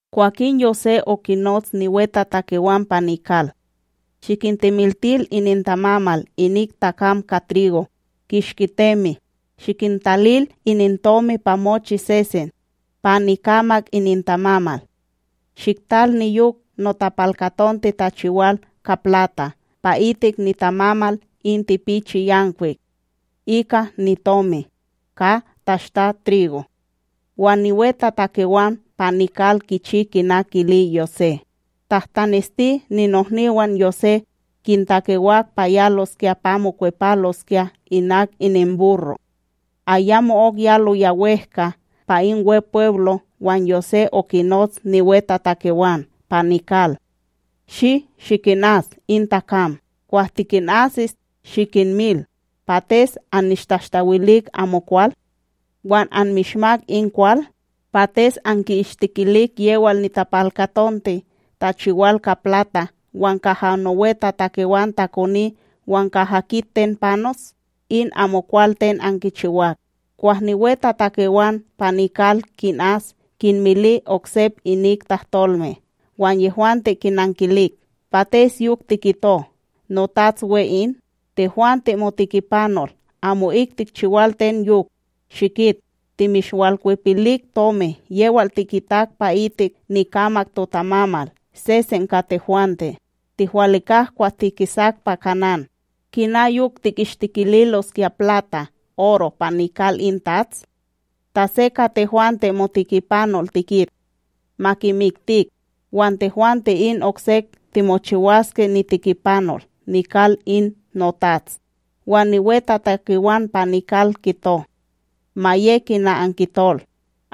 Kwakin Yosé okinots niwetatakewan pa nikal: “Shikintemiltil inintamamal inik takam ka trigo kishki temi, shikintalil inintomi pa mochi sesen pa nikamak inintamamal. Shiktal niyok notapalkatonte tachiwal ka plata pa itik nitamamal in tipichi yankwik ika nitomi, ka tashta trigo.” Wan niwetatakewan pa nikal kichi kina kili Yosé. Tahtanesti, ninohniwan Yosé kintakewak pa yaloskya pa mokwepaloskya inak ininburro'. Ayamo'ok yaloya wEhka pa in wepweblo' wan Yosé okinots niwetatakewan pa nikal: “Shi! Shikinas in takam! Kwah tikinasis, shikinmil: ’ Pates annishtashtawilik amokwal wan anmishmak in kwal? Pates anki'ishtikilik yewal nitapalkatonte tachiwal ka plata wan kaha nowetatakewan takoni wan kaha kit ten panos? In amokwal ten ankichiwak!” Kwah niwetatakewan pa nikal kinas, kinmili oksep inik tahtolme. Wan yehwante kinankilik: ―Pates yok tikito, notats we in? Tehwante motikipanol amo'ik tikchiwal ten yok! Shikit, timishwalkwepilik tomi yewal tikitak pa'itik nikamak totamamal sesen ka tehwante, tihwalikak kwah tikisak pa Kanán. Kina yok tikishtikililoskya plata, oro pa nikal in tats? Ta se ka tehwante motikipanol tikit, ma kimiktik wan tehwante, in oksek timochiwaske nitikipanol nikal in notats. Wan niwetatakewan pa nikal kito: ―Ma ye kina ankitol,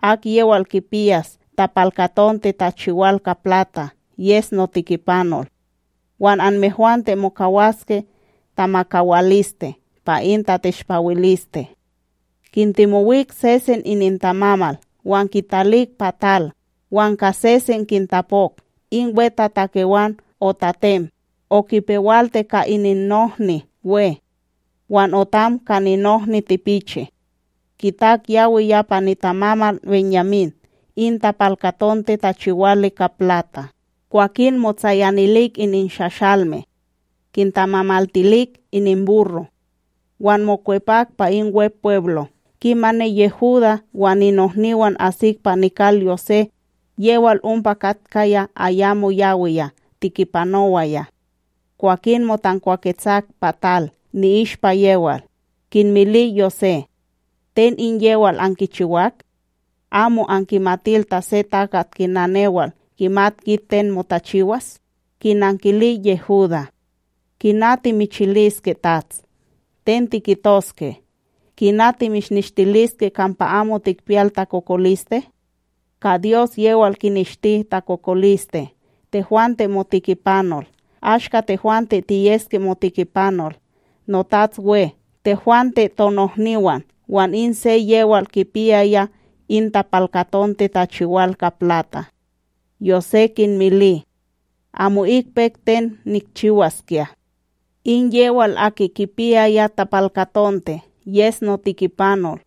akyewal kipiyas tapalkatonte tachiwal ka plata yes notikipanol; wan anmehwante mokawaske tamakawaliste pa in tateshpawiliste. Kintemowik sesen inintamamal wan kitalik pa tal, wan ka sesen kintapok. In wetatakewan otatem okipewalti ka ninnohni we wan otam ka ninohni tipichi. Kitak yawiya pa nitamamal BenYamím in tapalkatonte tachiwali ka plata! Kwakin motsayanilik ininshashalme.a Kintamamaltilik ininburro' wan mokwepak pa in Wepweblo. Kimani Yehudá wan ninohniwan asik pa nikal Yosé, yewal ompa katkaya ayamo yawiya tikipanowaya. Kwakin motankwawetsak pa tal ni'ishpa yewal, kinmili Yosé: ―Ten in yewal ankichiwak? Amo ankimatil ta se takat kina newal, kimat kit ten motachiwas? Kinankili Yehudá: ―Kina timichiliske Tats! Ten tikitoske! Kina timishnishtiliske kampa amo tikpiyal takokoliste? Ka Dyos yewal kineshti totakokoliste tehwante motikipanol. Ashka tehwante tiyeske motikipanol, notats we, tehwante tonohniwan wan in se yewal kipiyaya in tapalkatonte tachiwal ka plata. Yosé kinmili: ―Amo'ik pek ten nikchiwaskya! In yewal aki kipiyaya tapalkatonte yes notikipanol.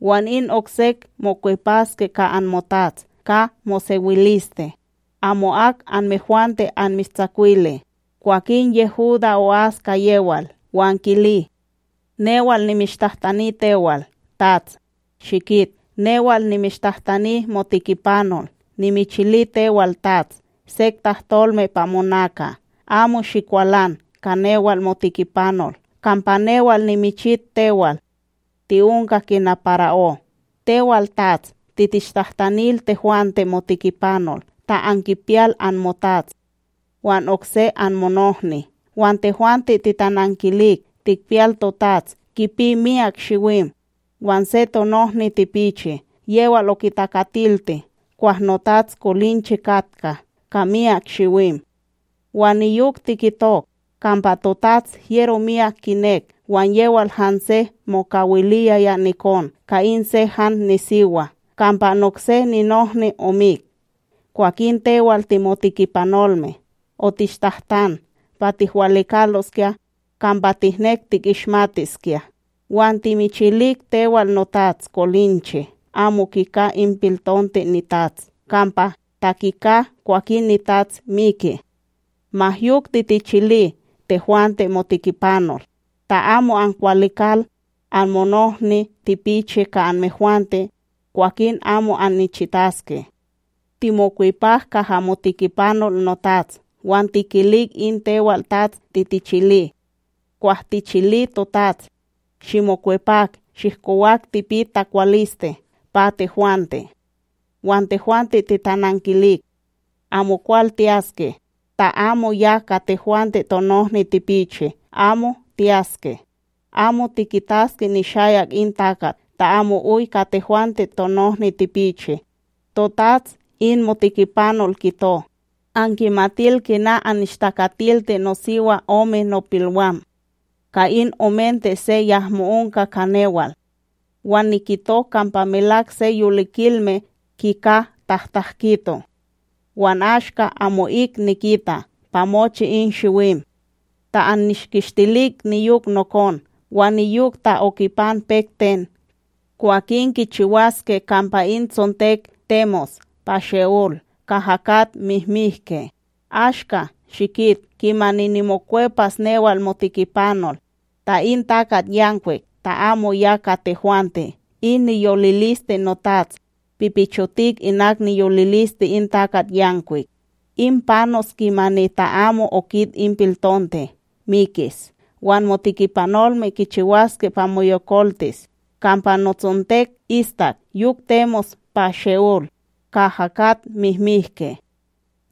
Wan in oksek mokwepaske ka anmotats ka mosewiliste, amo'ak anmehwante anmishtsakwili. Kwakin Yehudá o'as ka yewal wan kili: ―Newal nimishtahtani tewal, Tats, shikit newal nimishtahtani motikipanol nimichili tewal tats sek tahtolme pa monaka. Amo shikwalan ka newal motikipanol, kampa newal, nimichit tewal ti'onka kina para'ó. Tewal tats titishtahtanil tehwante motikipanol ta ankipiyal anmotats wan okse anmonohni, wan tehwante titanankilik tikpiyal totats kipi myak shiwim, wan se tonohni tipichi yewal okitakatilti kwah notats kolinche katka ka myak shiwim. Wan niyok tikitok kampa totats hyero miyak kinek wan yewal hanse mokawiliyaya nikon ka in se han nisiwa, kampa nokse ninohni omik. Kwakin tewal timotikipanolme otishtahtan pa tihwalikaloskya kampa tihnek tikishmatiskya. Wan timichilik tewal notats kolinche amo kika in piltonte nitats kampa, ta kika, kwakin nitats miki. Ma yok titichili tehwante motikipanol, ta amo ankwalikal anmonohni tipichi ka anmehwante, kwakin amo annichitaske. Timokwepak kaha motikipanol notats, wan tikilik in tewal tats titichili. Kwah tichili totats: “Shimokwepak shihkowak tipit takwaliste pa tehwante.” Wan tehwante titanankilik: “Amokwal tiyaske ta amo ya ka tehwante tonohni tipichi amo tiyaske. Amo tikitaske nishayak in takat ta amo oy ka tehwante tonohni tipichi.” Totats, in motikipanol, kito: “Ankimatil kina annishtakatilti nosiwa ome nopilwam. Ka in omente se yahmo onka ka newal. Wan nikito kampa melak se yolikilme kika tahtakito, wan ashka amo'ik nikita pa mochi in shiwim. Ta annishkishtilik niyok nokon, wan niyok ta okipan pek ten, kwakin kichiwaske kampa in tsontek temos pa She'olb kaha kat mihmihke!” ’Ashka, shikit, kimani nimokwepas newal motikipanol, ta in takatYankwik ta amo ya ka tehwante, in niyoliliste notats pipichotik inak niyoliliste in takatYankwik, in panos kimani ta amo okit in piltonte, mikis, wan motikipanolme kichiwaske pa moyokoltis kampa notsontek istak yok temos pa She'ol kaha kat mihmihke.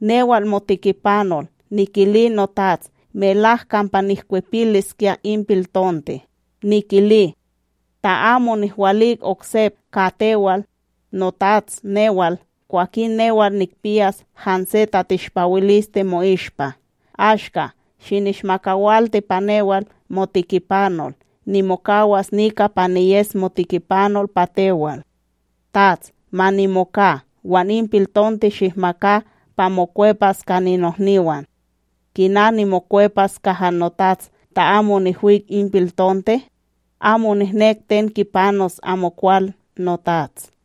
Newal motikipanol nikili notats melak kampa nihkwepiliskya in piltonte. Nikili: “Ta amo nihwalik oksep ka tewal, noTats newal, kwakin newal nikpiyas hanse tateshpawiliste mo'ishpa.” Ashka, shinishmakawilti pa newal motikipanol nimokawas nika pa niyes motikipanol pa tewal, tats ma nimoka wan in piltonte shihmaka pa mokwepas ka ninohniwan. Kina nimokwepas kaha notats ta amo nihwik in piltonte? Amo nihnek ten kipanos amokwal notats!